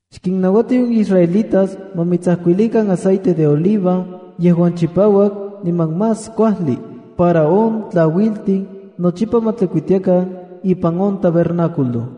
“Xkinnauati on israelitas ma mitsajkuilikan aceite de oliva yejuan chipauak niman más kuajli para on tlauiltin nochipa ma tlikuitiakan ipan on tabernáculo.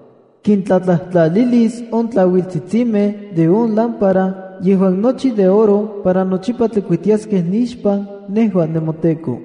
Kintlatlajtlalilis on tlauiltsitsimej de on lámpara yejuan nochi de oro para nochipa tlikuitiaskej nixpan nejua nemoTEKO.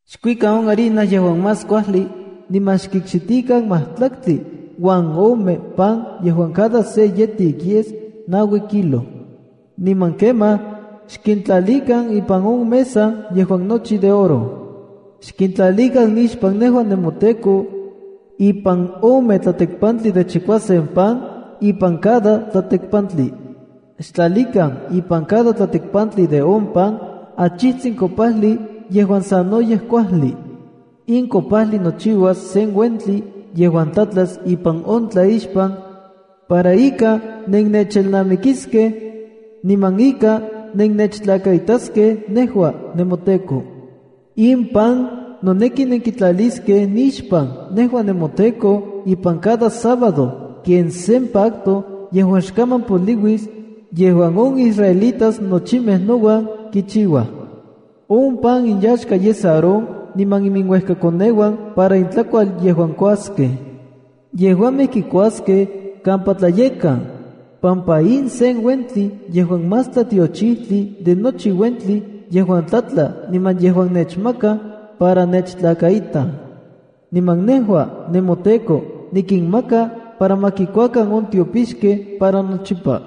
’Xkuikan on harina yejuan más kuajli niman xkikxitikan majtlaktli uan ome pan yejuan cada se yetik yes naui kilo. Niman kemaj xkintlalikan ipan on mesa yejuan nochi de oro. Xkintlalikan nixpan nejua nemoTEKO, ipan ome tlatekpantli de chichikuasen pan ipan cada tlatekpantli. Xtlalikan ipan cada tlatekpantli de on pan, achitsin kopajli yejuan sanoyej kuajli. In kopajli nochiuas sen uentli yejuan tlatlas ipan on tlaixpan para ika nennechelnamikiskej, niman ika nennechtlakaitaskej nejua nemoTEKO. In pan noneki nenkitlaliskej nixpan nejua nemoTEKO ipan cada sábado ken sen pacto yejuan xkaman poliuis, yejuan on israelitas nochimej nouan kichiuaj. On pan inyaxka yes Aarón niman iuejkakoneuan para intlakual yejuan kuaskej. Yejuamej kikuaskej kampa tlayekkan, pampa in sen uentli yejuan más tlatiochijtli de nochi uentli yejuan tlatla niman yejuan nechmakaj para nechtlakaitaj. Niman nejua nemoTEKO nikinmaka para ma kikuakan on tiopixkej para nochipa.”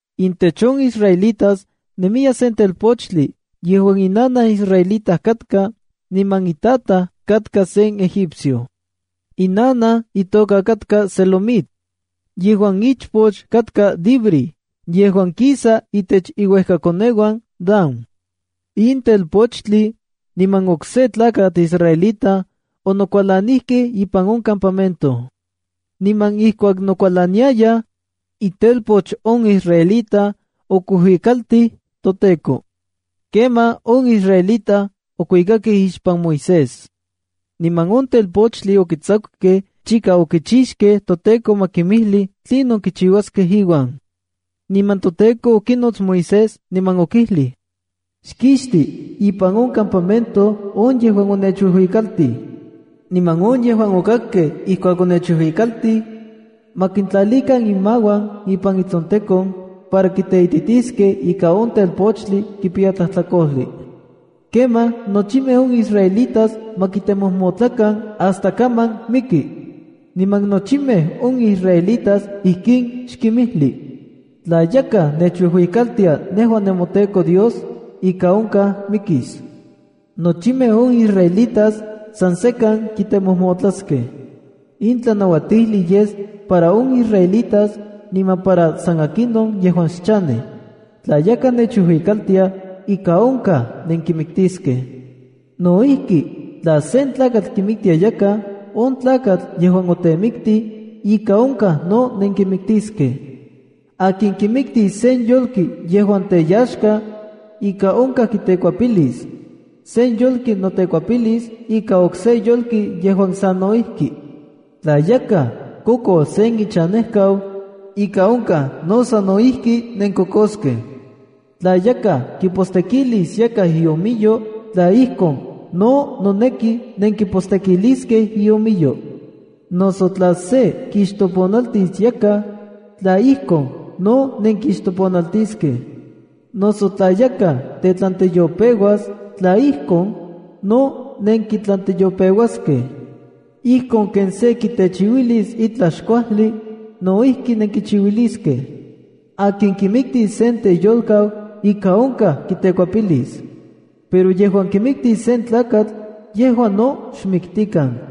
Intech on israelitas nemiya sen telpochtli yejuan inanaj israelita katka, niman itataj katka sen Egipcio. Inanaj itoka katka Selomit, yejuan ichpoch katka Dibri yejuan kisa itech iuekakoneuan Dan. In telpochtli niman okse tlakatl israelita onokualanijkej ipan on campamento. Niman ijkuak nokualaniayaj, itelpoch on israelita okuijuikaltij toTEKO. Kemaj on israelitas okuikakej ixpan Moisés. Niman on telpochtli okitsakukej chika okichixkej toTEKO ma kimijli tlinon kichiuaskej iuan. Niman toTEKO okinots Moisés niman okijlij: “Xkixti ipan on campamento on yejuan onechuijuikaltij. Niman on yejuan okakkej ijkuak onechuijuikaltij, ma kintlalikan inmauan ipan itsontekon para kiteititiskej ika on telpochtli kipiya tlajtlakojli. Kemaj nochimej on israelitas ma kitemojmotlakan hasta kaman miki. Niman nochimej on israelitas ijkin xkinmijli: “Tla yakaj nechuijuikaltia nejua nemoTeko Dios, ika onkaj mikis. Nochimej on israelitas san sekan kitemojmotlaskej. In tlanauatijli yes para on israelitas, niman para san akinon yejuan xchanej. Tla yakaj nechuijuikaltia, ika onkaj nenkimiktiskej. ’No ijki, tla sen tlakatl kimiktis yakaj, on tlakatl yejuan otemiktij ika onkaj no nenkimiktiskej. ’Akin kimiktis sen yolki yejuan teyaxka, ika onkaj kitekuepilis. Se yolki notekuepilis ika okse yolki yejuan sa no ijki. ’Tla yakaj kokos sen ichanejkau, ika onkaj no sano ijki nenkokoskej. Tla yakaj kipostekilis yakaj iomiyo, tla ijkon, no noneki nenkipostekiliskej iomiyo. Noso tla se kixtoponaltis yakaj, tla ijkon, no nenkixtoponaltiskej. Noso tla yakaj tetlanteyopeuas, tla ijkon, no nenkitlanteyopeuaskej. Ijkon ken se kitechiuilis itlaj xkuajli, no ijki nenkichiuiliskej. ’Akin kimiktis sen teyolkau, ika onkaj kitekuepilis. Pero yejuan kimiktis sen tlakatl, yejua no xmiktikan.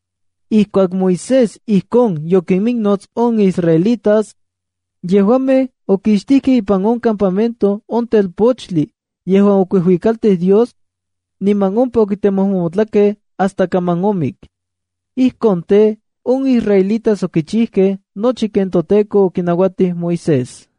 Ijkuak Moisés ijkon yokiminnots on israelitas, yejuamej okixtijkej ipan on campamento on telpochtli yejuan okuijuikaltij Dios, niman ompa okitemojmotlakej hasta kaman omik. Ijkon tej, on israelitas okichijkej nochi ken toTEKO okinauatij Moisés.